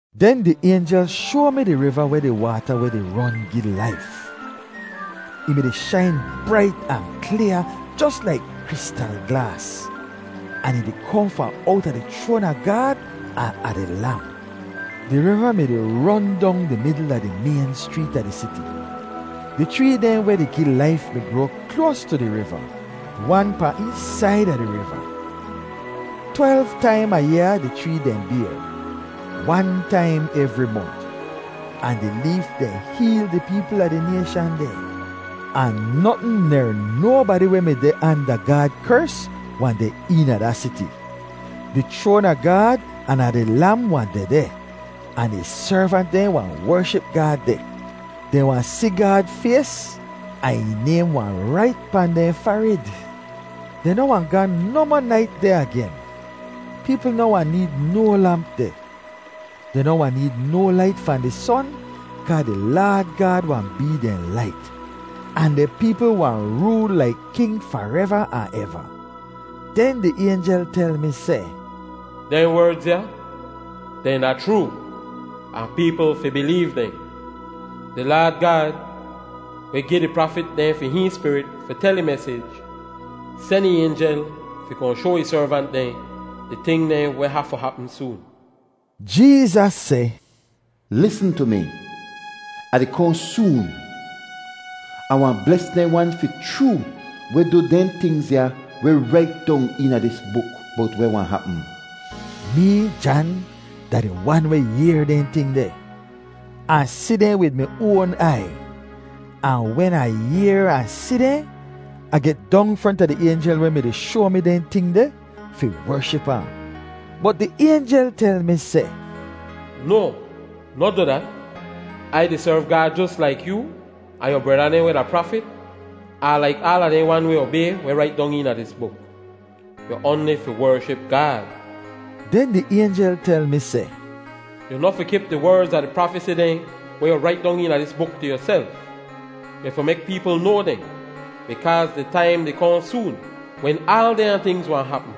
Den di aynjel shoa mi di riva weh di waata weh di ron gi laif. Ih mi-di shain brait ahn klyaa jos laik kristal glaas, ahn ih di kohn fahn owta di chroan a Gaad ahn a di Lam. Di riva mi-di ron dong di midl a di mayn schreet a di siti. Di chree dehn weh di gi laif mi groa kloas tu di riva, wan pahn eech said a di riva. Twelv taim a yaa di chree dehn bayr, wan taim evri mont. Ahn di leef dehn heel di peepl a di nayshan dehn. Ahn notn ner nobadi weh mi deh anda Gaad kers wahn deh eena da siti. Di chroan a Gaad ahn a di Lam wahn dehdeh, ahn ih servant dehn wahn wership Gaad deh. Dehn wahn si Gaad fays, ahn ih naym wahn rait pahn dehn farid. Dehn noh wahn ga nohmoh nait deh agen. Peepl noh wahn need no lamp deh. Dehn noh wahn need no lait fahn di son, kaa di Laad Gaad wahn bee dehn lait. Ahn di peepl wahn rool laik king fareva ahn eva. Den di aynjel tel mi seh, “Dehn werdz ya, dehn da chroo ahn peepl fi bileev dehn. Di Laad Gaad, weh gi di prafit dehn fi hihn Spirit fi tel ih mesij, sen ih aynjel fi kohn shoa ih servant dehn di ting dehn weh hafu hapm soon.” Jeezas seh, “Lisn tu mi! Ah di kohn soon! Ah wahn bles dehn wan fi chroo weh du dehn tingz ya weh rait dong eena dis buk bowt weh wahn hapm.” Mee, Jan, da di wan weh yehr dehn ting deh. Ah si dehn wid mi oan aiy. Ahn wen Ah yehr ahn si dehn, Ah get dong fronta di aynjel weh mi-di shoa mi dehn ting deh fi wership ahn. Bot di aynjel tel mi seh, “No, noh du dat! Ai di serv Gaad jos laik yoo, ahn yu breda dehn weh da prafit, ahn laik aala dehn wan weh obay weh rait dong eena dis buk. Yu oanli fi wership Gaad!” Den di aynjel tel mi seh, “Yu noh fi kip di werdz a di prafesi dehn weh yu rait dong eena dis buk tu yuself! Yu fi mek peepl noa dehn, bikaaz di taim di kohn soon wen aal dehnya tingz wahn hapm.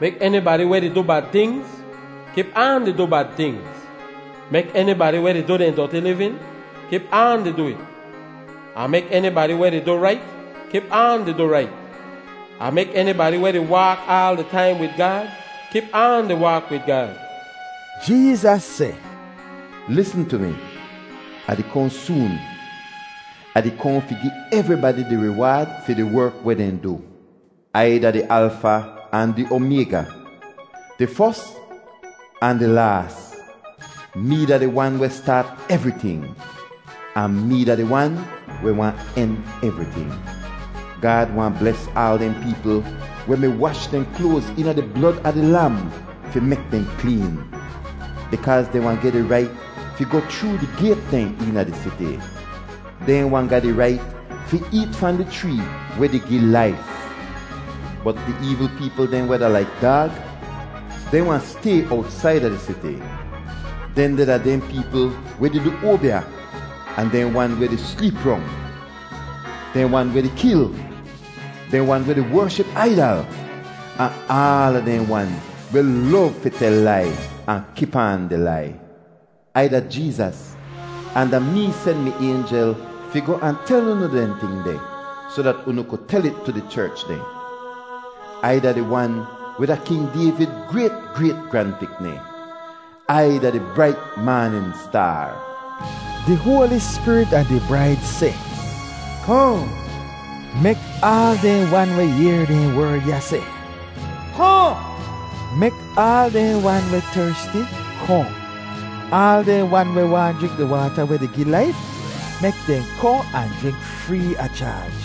Mek enibadi weh di du bad tingz kip aan di du bad tingz. Mek enibadi weh di du dehn doti livin kip aan di du it. Ahn mek enibadi weh di du rait kip aan di du rait, ahn mek enibadi weh di waak aal di taim wid Gaad kip aan di waak wid Gaad.” Jeezas seh, “Lisn tu mi! Ah di kohn soon! Ah di kohn fi gi evribadi di riwaad fi di werk weh dehn du. Ai da di Alfa ahn di Omayga, di fos ahn di laas. Mee da di Wan weh staat evriting, ahn mee da di Wan weh wahn en evriting.” Gaad wahn bles aal dehn peepl weh mi wash dehn kloaz eena di blod a di Lam fi mek dehn kleen, bikaaz dehn wahn geh di rait fi goh chroo di gayt dehn eena di siti. Dehn wahn ga di rait fi eet fahn di chree weh di gi laif. Bot di eevl peepl dehn weh da laik daag, dehn wahn stay owtsaida di siti. Dehndeh da dehn peepl weh di du oabya, ahn dehn wan weh di sleep rong, dehn wan weh di kil, dehn wan weh di wership aidal, ahn aala dehn wan weh lov fi tel lai ahn kip aan di lai. “Ai da Jeezas, ahn da mee sen mi aynjel fi goh ahn tel unu dehn ting deh soh dat unu ku tel it tu di cherch dehn. Ai da di Wan weh da King Dayvid grayt, grayt, gran-pikni. Ai da di brait maanin staar.” Di Hoali Spirit ahn di braid seh, “Kohn!” Mek aal dehn wan weh yehr dehn werd ya seh, “Kohn!” Mek aal dehn wan weh tersti, kohn. Aal dehn wan weh waahn jrink di waata weh di gi laif, mek dehn kohn ahn jrink free a chaaj.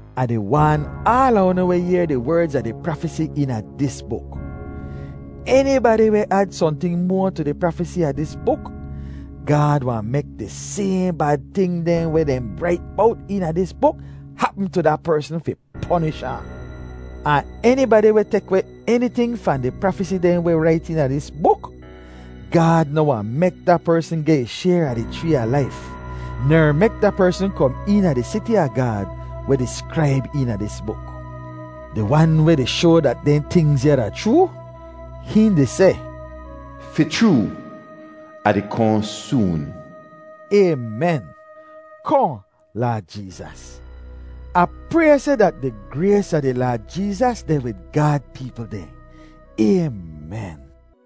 Ah di waan aala unu weh yehr di werdz a di prafesi eena dis buk: Enibadi weh ad sohnting moa tu di prafesi a dis buk, Gaad wahn mek di sayhn bad ting dehn weh dehn rait bowt eena dis buk hapm tu da persn fi ponish ahn. Ahn enibadi weh tek weh eniting fahn di prafesi dehn weh rait eena dis buk, Gaad noh wahn mek da persn geh ih shayr a di chree a laif, ner mek da persn kom eena di siti a Gaad, weh diskraib eena dis buk. Di Wan weh di shoa dat dehn tingz ya da chroo, hihn di seh, “Fi chroo, Ah di kohn soon.” Aymen. Kohn, Laad Jeezas! Ah pray seh dat di grays a di Laad Jeezas deh wid Gaad peepl dehn. Aymen.